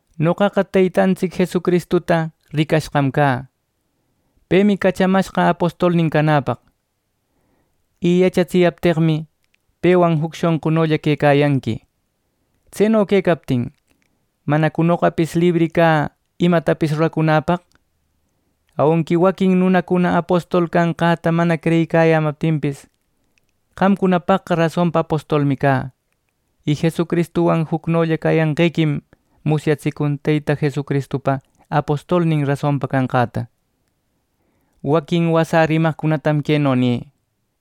Noqaqa Teytantsic Jesucristuta ricashqam cä. Pemi cachamashqa apostolnin canäpaq; y yachatsiyapteqmi, pewan juc shonqunolla quecayanqui. Tseno quecaptin ¿manacu noqapis libri cä imatapis ruracunäpaq! Aunqui waquin nunacuna apostol canqäta mana creyiyämaptinpis, qamcunapaqqa rasonpa apostolmi cä. Y Jesucristuwan jucnolla cayanqequim musyatsicun Teyta Jesucristupa apostolnin rasonpa canqäta. Waquin wasä rimaqcunatam queno nï: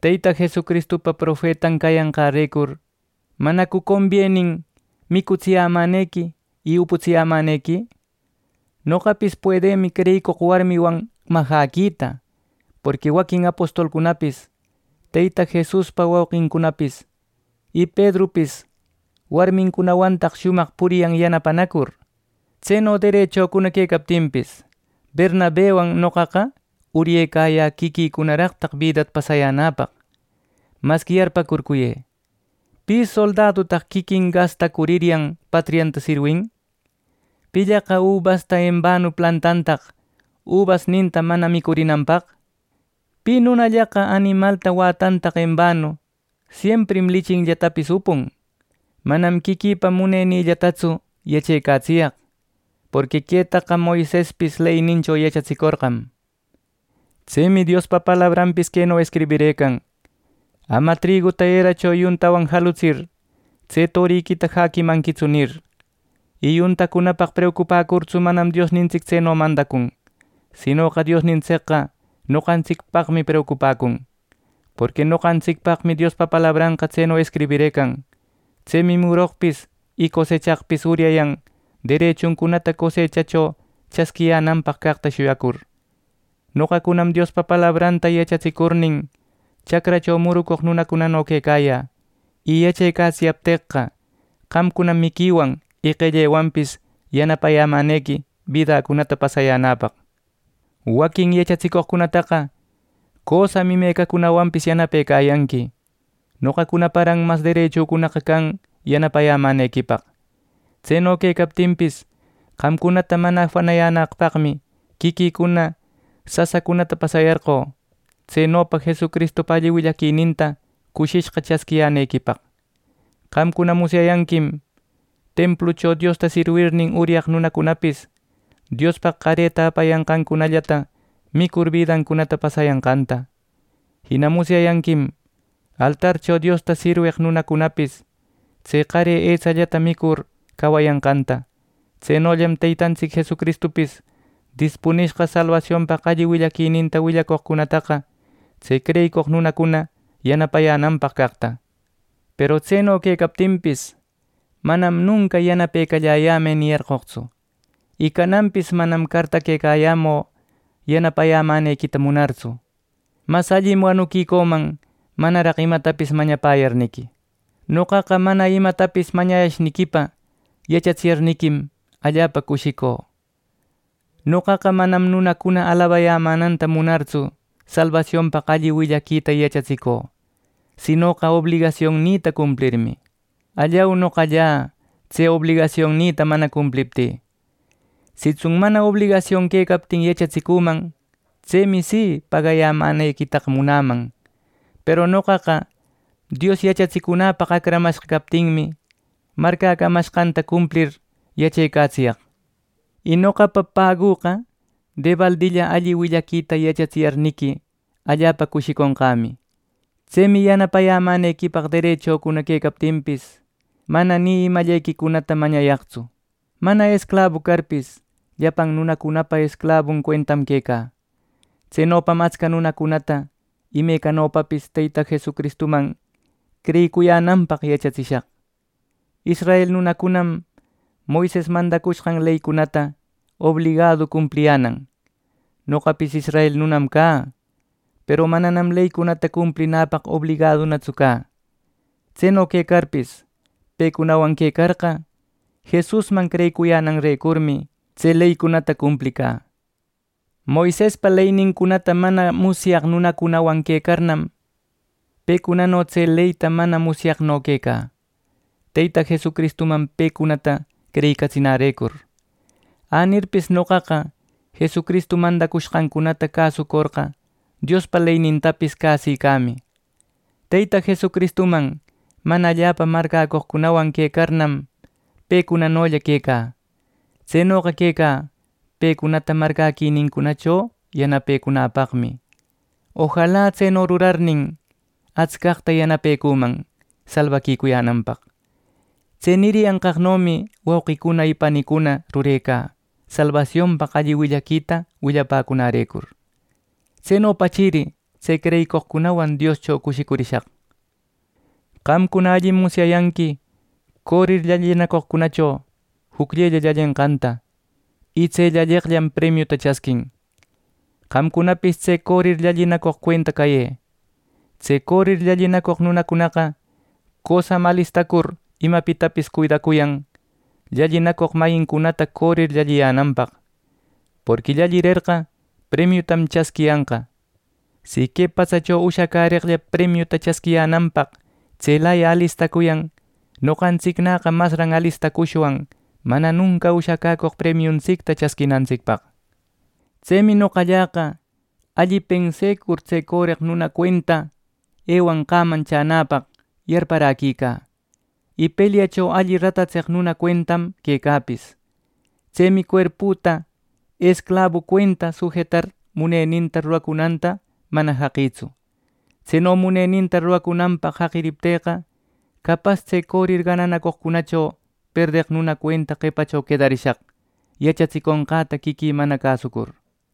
Teyta Jesucristupa profetan cayanqärecur, ¿manacu combienin micutsiyämänequi y uputsiyämänequi? Noqapis puedïmi creyicoq warmiwan majäquita; porqui waquin apostolcunapis, Teyta Jesuspa wauqincunapis y Pedrupis warmincunawantaq shumaq puriyan yanapanacur. Tseno derechücuna quecaptinpis, Bernabewan noqaqa uryecayä quiquïcunaraqtaq bidata pasayänäpaq. Masqui yarpäcurcuyë, ¿pi soldadutaq quiquin gastacurcuryan patrianta sirwin! ¿Pillaqa ubasta enbanu plantantaq ubasninta mana micurinanpaq! ¿Pi nunallaqa animalta wätantaq enbanu! Siemprim lichinllatapis upun. Manam quiquïpa munenïllatatsu yachecatsiyaq, porqui quetaqa Moisespis leynincho yachatsicorqam. Tsemi Diospa palabranpis queno escribirëcan: “Ama triguta eracho yuntawan jalutsir, tse toriquita jäquimanquitsu” nir, y yuntacunapaq preucupäcurtsu manam Diosnintsic tseno mandacun; sinoqa Diosnintsicqa noqantsicpaqmi preucupäcun, porqui noqantsicpaqmi Diospa palabranqa tseno escribirëcan. Tsemi muroqpis y cosechaqpis uryayan derechuncunata cosechacho chasquiyänanpaq caqta shuyacur. Noqacunam Diospa palabranta yachatsicurnin, chacracho muroq nunacunano quecayä y yachecatsiyapteqqa, qamcunam miquiwan y qellewanpis yanapayämänequi bidacunata pasayänäpaq. Waquin yachatsicoqcunataqa cösam imecacunawanpis yanapecayanqui; noqacunaparan mas derechücunaqa can yanapayämänequipaq. Tseno quecaptinpis, qamcunata mana afanayänaqpaqmi quiquïcuna sasacunata pasayarqö, tsenopa Jesucristupa alli willaquininta cushishqa chasquiyänequipaq. Qamcuna musyayanquim templucho Diosta sirwirnin, uryaq nunacunapis Diospaq qareta apayanqancunallata micur bidancunata pasayanqanta. Jina musyayanquim altarcho Diosta sirweq nunacunapis tse qare etsallata micur cawayanqanta. Tsenollam Teytantsic Jesucristupis dispunishqa salbasionpaq alli willaquininta willacoqcunataqa tse creyicoq nunacuna yanapayänanpaq caqta. Peru tseno quecaptinpis, manam nunca “Yanapecalläyämë” niyarqoqtsu; y cananpis manam cartaquecayämü yanapayämänequita munartsu. ¡Mas allim wanuquicüman manaraq imatapis mañapäyarniqui! ¡Noqaqa mana imatapis mañayashniquipa yachatsiyarniquim allapa cushicü! Noqaqa manam nunacuna alabayämänanta munartsu salbasionpaq alli willaquita yachatsicü, sinoqa obligasionnïta cumplirmi. ¡Allau, noqallä tse obligasionnïta mana cumpliptï! Sitsun mana obligasion quecaptin yachatsicüman; tsemi si, pagayämänequitaqa munäman; peru noqaqa Dios yachatsicunäpaq acramashqa captinmi marcäcamashqanta cumplir yachecatsiyaq. Y noqapa pagüqa debaldilla alli willaquita yachatsiyarniqui, allapa cushiconqämi. Tsemi yanapayämänequipaq derechücuna quecaptinpis, mana ni imallequicunata mañayaqtsu. Mana esclabu carpis, llapan nunacunapa esclabun cuentam quecä. Tsenopam atsca nunacunata imecanopapis Teyta Jesucristuman creyicuyänanpaq yachatsishaq. Israel nunacunam Moises mandacushqan leycunata obligadu cumpliyänan. Noqapis israel nunam cä, peru mananam leycunata cumplinäpaq obligadutsu cä. Tseno quecarpis, pecunawan quecarqa, Jesusman creyicuyänanrecurmi tse leynincunata cumplicä. Moisespa leynincunata mana musyaq nunacunawan quecarnam, pecunano tse leyta mana musyaqno quecä Teyta Jesucristuman pecunata creyicatsinärecur. Änirpis noqaqa Jesucristu mandacushqancunata cäsorqa, Diospa leynintapis cäsicämi. Teyta Jesucristuman mana allapa marcäcoqcunawan quecarnam, pecunanolla quecä. Tsenoqa quecä pecunata marcäquinincunacho yanapecunäpaqmi. Ojala tseno rurarnin, atscaqta yanapecüman salbaquicuyänanpaq. Tse niriyanqaqnomi, wauqicuna y panicuna, rurecä, salbasionpaq alli willaquita willapäcunärecur. Tsenopachiri tse creyicoqcunawan Dioscho cushicurishaq. Qamcuna allim musyayanqui corir llallinacoqcunacho jucllella llallenqanta, y tse llalleqllam premiuta chasquin. Qamcunapis tse corir llallinacoq cuenta cayë. Tse corir llallinacoq nunacunaqa cösam alistacur imapitapis cuidacuyan llallinacoq mayincunata corir llalliyänanpaq, porqui llallirerqa premiutam chasquiyanqa. Si, que patsacho ushacäreqlla premiuta chasquiyänanpaq tselaya alistacuyan, noqantsicnäqa masran alistacushwan mana nunca ushacäcoq premiuntsicta chasquinantsicpaq. Tsemi noqalläqa alli pensecur tse coreq nuna cuenta ewanqäman chänäpaq yarparäquicä, y pelyacho alli ratatseq nuna cuentam quecäpis. Tsemi cuerpüta esclabu cuentata sujetar muneninta ruracunanta mana jaqïtsu. Tseno muneninta ruracunanpaq jaqiriptïqa, capas tse corir gananacoqcunacho perdeq nuna cuenta qepacho quedarishaq, yachatsiconqäta quiquï mana cäsucur.